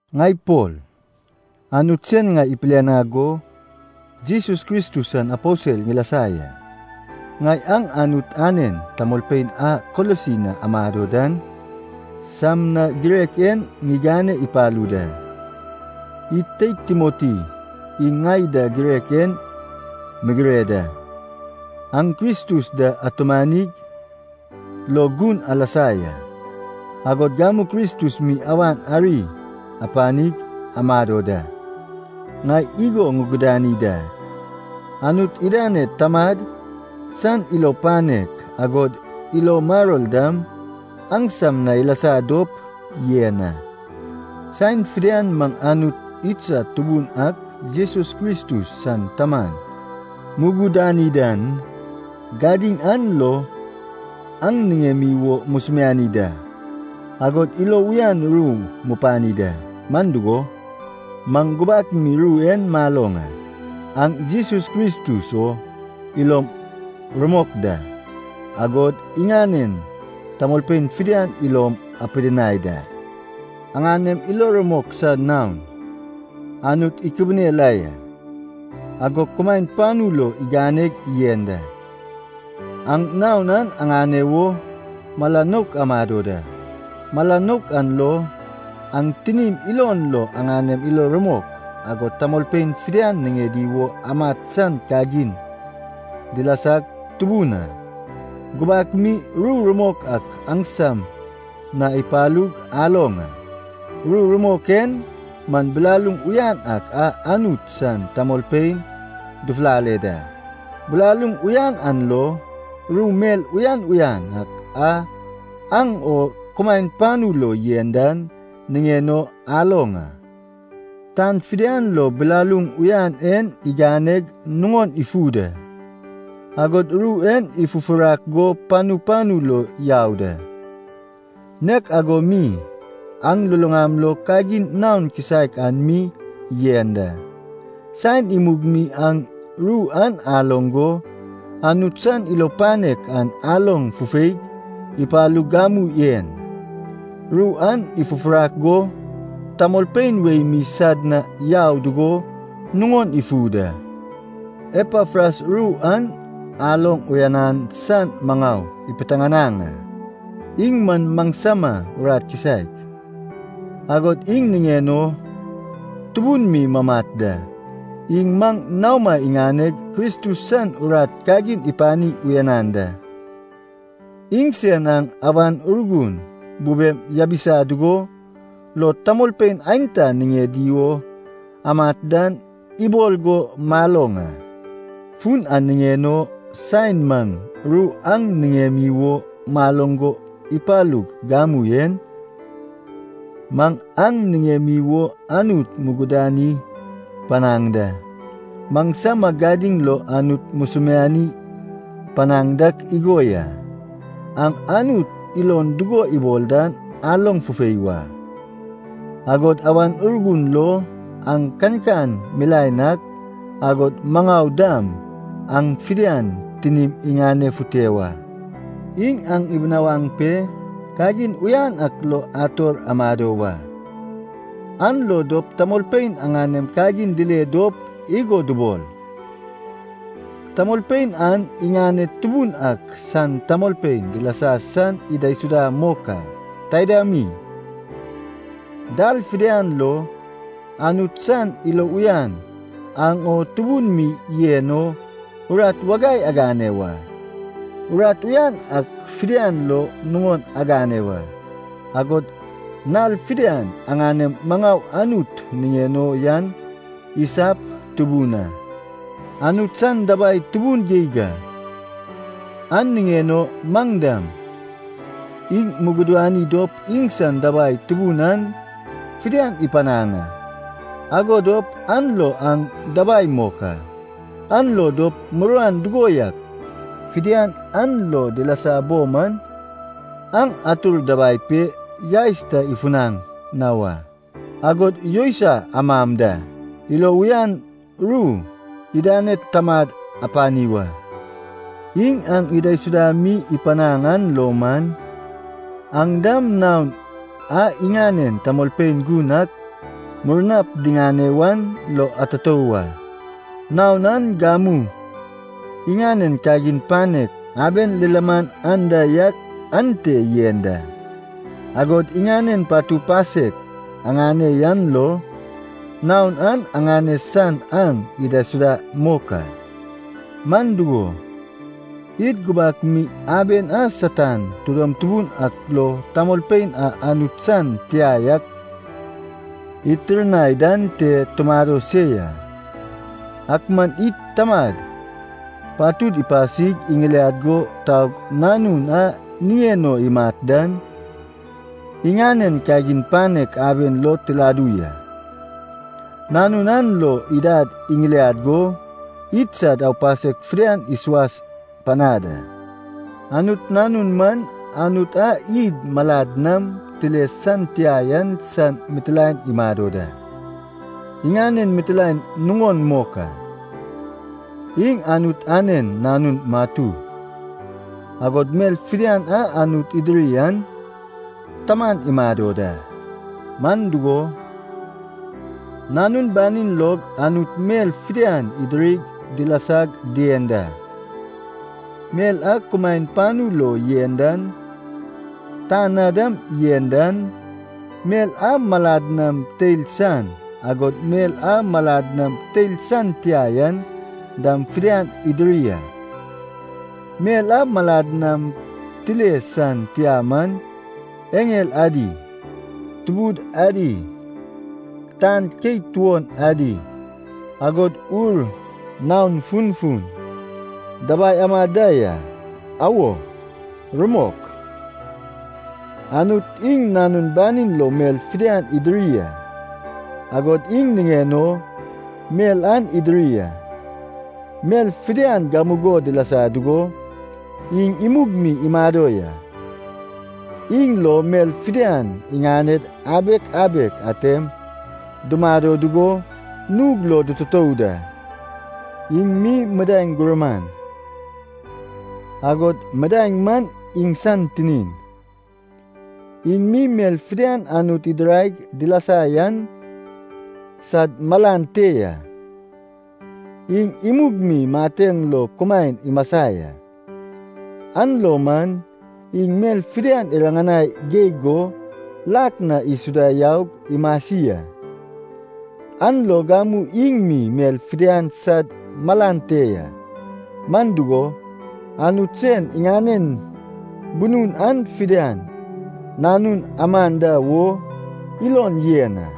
Ŋai Pol, Anut sen ŋai ipilianag go, Jesus Kristus san aposel ŋilasa ya. Ŋai aŋ, Anut anen tamolpein a Kolosi na amado dan, sam na girek en ŋigane ipalu da. Id teid Timoti iŋ ŋai da girek en migire da. Aŋ Kristus da atumanig lo gun alasa ya. Agod gamu Kristus mi awan ari apanig amado da. Ŋai igo ŋugudani dak, Anut idaned Tamad san ilo panek, agod ilo maror dam, aŋsam na ilasa dop yen a. Saen fidian maŋ Anut idsad Tubun ak Jesus Kristus san Taman mugudani dan, gadiŋ an lo aŋ niŋemi wo musumiani da, agod ilo uyan ru mupani da. Man dugo, maŋ gubak mi ru en maloŋ a, aŋ Jesus Kristus o ilom rumok da, agod iŋanen tamolpein fidian ilom apidinai da. Aŋanem ilo rumok san naon, Anut ikibine la ya, agog kumaen panu lo iganeg yen da. Aŋ naon an aŋane wo mala nouk amado da. Mala nouk an lo, aŋ tinim ilon lo aŋanem ilo rumok, agod tamolpein fidian niŋedi wo amat san kagin dilasag tubun a. Gubak mi ru rumok ak aŋsam na ipalug aloŋ a. Ru rumok en man bilaluŋ uyan ak a Anut san tamolpein dufulale da. Bilaluŋ uyan an lo, ru mel uyan uyan ak a aŋ o kumaen panu lo yen dan niŋen o aloŋ a. Tan fidian lo bilaluŋ uyan en iganeg nuŋon ifu da, agod ru en ifufurak go panu panu lo yau da. Nek ago mi, aŋ luluŋam lo kagin naon kisaek an mi yen da, saen imug mi aŋ ru an aloŋ go, Anut san ilo panek an aloŋ fufeig ipalug gamu en, ru an ifufurak go tamolpein wei mi sad na yau dugo nuŋon ifu da. Epafras ru an aloŋ uyanan san maŋau ipiteŋanaŋ a. Iŋ man maŋsama urat kisaek, agod iŋ niŋen o tubun mi mamat da. Iŋ maŋ naoma iŋaneg Kristus san urat kagin ipani uyanan da. Iŋsen aŋ, Awan Urgun bubem yabisa dugo, lo tamolpein aenta niŋedi wo amat dan, ibol go maloŋ a. Fun an niŋen o, saen maŋ ru aŋ niŋemi wo maloŋ go ipalug gamu en, maŋ aŋ niŋemi wo Anut mugudani panaŋ da. Maŋsama gadiŋ lo Anut musumiani panaŋ dak igo ya. Aŋ Anut ilon dugo ibol dan aloŋ fufei wa, agod Awan Urgun lo, aŋ kankan milaen ak, agod maŋau dam aŋ fidian tinim iŋanefute wa. Iŋ aŋ ibinawaŋ pe, kagin uyan ak lo ator amado wa, an lo dop tamolpein aŋanem kagin dile dop igo dubol, “tamolpein an iŋaned Tubun ak san tamolpein dilasa san idaisuda mok a.” Taida mi, dal fidian lo, Anut san ilo uyan aŋ o tubun mi yen o, urat wagai agane wa. Urat uyan ak fidian lo nuŋon agane wa, agod nal fidian aŋanem maŋau Anut niŋen o yan isap tubun a. Anut san dabai tubun geig a, an niŋen o maŋ dam, iŋ mugudani dop iŋsan dabai tubun an fidian ipanaŋ a, ago dop, an lo aŋ dabai mok a. An lo dop muruan dugo yak fidian aŋ lo dilasa bo man, aŋ atur dabai pe, yaes ta ifunaŋ na wa, agod yousai amam da, ilo uyan ru idaned Tamad apani wa. Iŋ aŋ idaisuda mi ipanaŋ an lo man, aŋ dam naon a iŋanen tamolpein gun ak murnap diŋane wan lo atutou wa. Naon an gamu iŋanen kagin panek aben lilaman anda yak, ante yen da. Agod iŋanen patu pasek aŋane yan lo, naon an aŋane san aŋ idaisuda mok a. Man dugo, id gubak mi aben a Satan tidom tubun ak lo tamolpein a Anut san tia yak itirnai dan te tumado se ya. Ak man id Tamad patud ipasig iŋiliag go taug Nanun a niŋen o imat dan, iŋanen kagin panek aben lo tiladu ya. Nanun an lo idad iŋiliad go, idsad aupasek fidian isuas panad a. Anut Nanun man Anut a id malad nam tile san tia yan san mitilaen imado da, iŋanen mitilaen nuŋon mok a. Iŋ Anut anen nanun matu, agod mel fidian a Anut idiri an taman imado da. Man dugo, Nanun banin log Anut mel fidian idirig dilasag dien da. Mel a kumaen panu lo yen dan, tan na dam yen dan, mel a malad nam teil san, agod mel a malad nam tile san tia yan dam fidian idiri a. Mel a malad nam tile san tia man, eŋel adi, tubud adi, tan keit tuon adi, agod ur naon funfun dabai amad da ya. Awo, rumok, Anut iŋ Nanun banin lo mel fidian idiri a, agod iŋ niŋen o mel an idiri a. Mel fidian gamugo dilasa dugo, iŋ imug mi imado ya. Iŋ lo mel fidian iŋaned abek abek atem dumado dugo, nug lo dututou da. Iŋ mi midaeŋ gurman, agod midaeŋ man iŋsan tinin. Iŋ mi mel fidian Anut idiraig dilasa yan sad malan te ya, iŋ imug mi mateŋ lo kumaen imasa ya, an lo man iŋ mel fidian iriŋanai geig go, lak na isuda yaug imasi a. An lo gamu iŋ mi mel fidian sad malan te ya. Man dugo, Anut sen iŋanen bunun an fidian, Nanun aman da wo ilon yen a.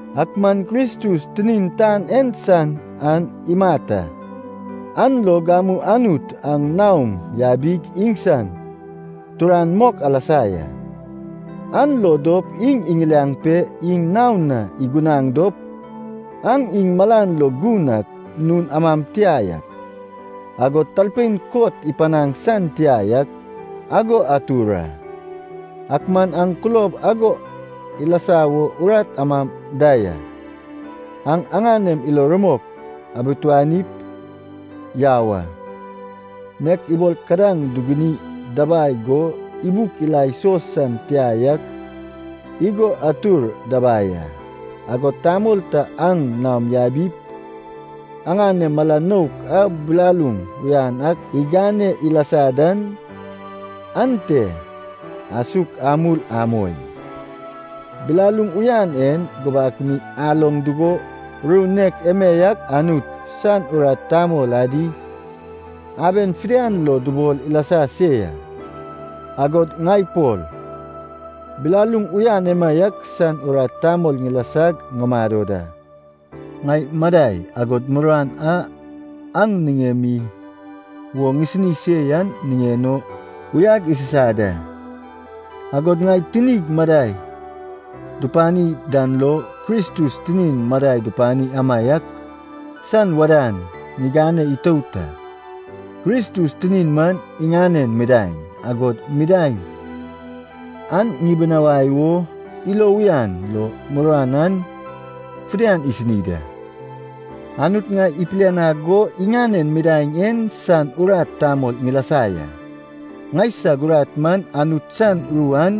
Ak man Kristus tinin tan en san an imat a. An lo gamu Anut aŋ naom yabig iŋsan turan mok alasa ya. An lo dop iŋ iŋiliaŋ pe iŋ naon na igunaŋ dop, aŋ iŋ malan lo gun ak, nun amam tia yak, agod talpein kot ipanaŋ san tia yak, ago atur a. Ak man aŋ kulob ago ilasa wo urat amam da ya. Aŋ aŋanem ilo rumok abituanip yau a. Nek ibol kadaŋ duguni dabai go ibuk ila iso san tia yak igo atur dabai a. Agod tamol ta aŋ naom yabip, aŋanem mala nouk a bilaluŋ uyan ak igane ilasa dan, ante asuk amul amoi. Bilaluŋ uyan en gubak mi aloŋ dugo, ru nek emaiak Anut san urat tamol adi aben fidian lo dubol ilasa se ya. Agod ŋai Pol, bilaluŋ uyan emaiak san urat tamol ŋilasag ŋumado da. Ŋai madai, agod muruan a aŋ niŋemi wo ŋisini se yan niŋen o uyag isusa da, agod ŋai tinig madai dupani dan lo, Kristus tinin madai dupani amaiak san wadan ŋigane itout a. Kristus tinin man iŋanen midaeŋ, agod midaeŋ an ŋibinawai wo, ilo uyan lo muruan an fidian ŋisini da. Anut ŋai ipilianag go, iŋanen midaeŋ en san urat tamol ŋilasa ya. Ŋaisag urat man, Anut san ru an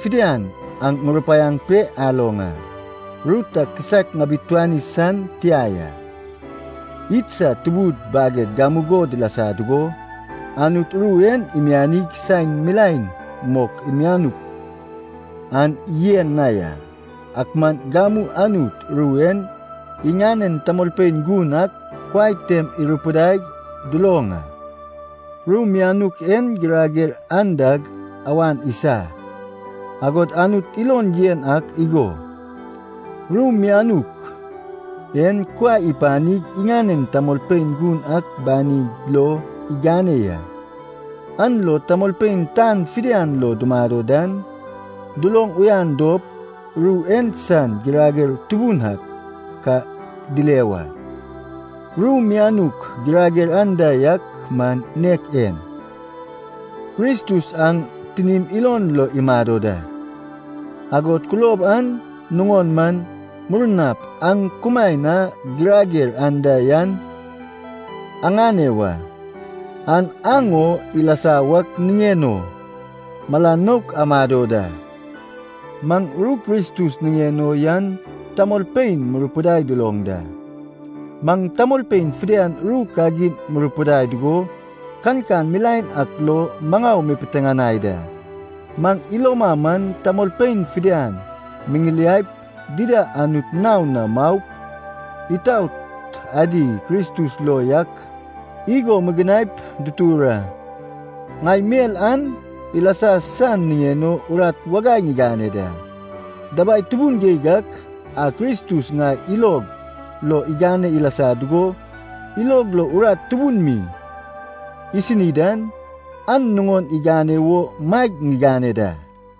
fidian aŋ ŋurupaiaŋ pe aloŋ a, ru ta kisaek ŋabituani san tia ya. Idsad tubud baged gamugo dilasa dugo, Anut ru en imianig saen milaen mok imianuk an yen na ya. Ak man gamu Anut ru en iŋanen tamolpein gun ak kuai tem irupidaig duloŋ a. Ru mianuk en girager andag awan isa. Agod Anut ilon yen ak igo, ru mianuk en kuai ipanig iŋanen tamolpein gun ak banid lo igane ya, an lo tamolpein tan fidian lo dumado dan, duloŋ uyan dop, ru en san girager tubun ak ka dile wa. Ru mianuk girager anda yak man nek en: Kristus aŋ tinim ilon lo imado da. Agod kulob an nuŋon man, murnap aŋ kumaen a girager anda yan aŋane wa. An aŋ o ilasa wak niŋen o mala nouk amado da. Maŋ ru Kristus niŋen o yan tamolpein murupidai duloŋ da. Maŋ tamolpein fidian ru kagin murupidai dugo, kankan milaen ak lo maŋau mupiteŋanai da. Maŋ iloma man, tamolpein fidian miŋiliaip, dida Anut naon na maup, itaot adi Kristus lo yak igo mugunaip dutur a. Ŋai mel an ilasa san niŋen o urat wagai ŋigane da. Dabai tubun geig ak a Kristus ŋai ilog lo igane ilasa dugo, ilog lo urat tubun mi isini dan, an nuŋon igane wo maeg ŋigane da.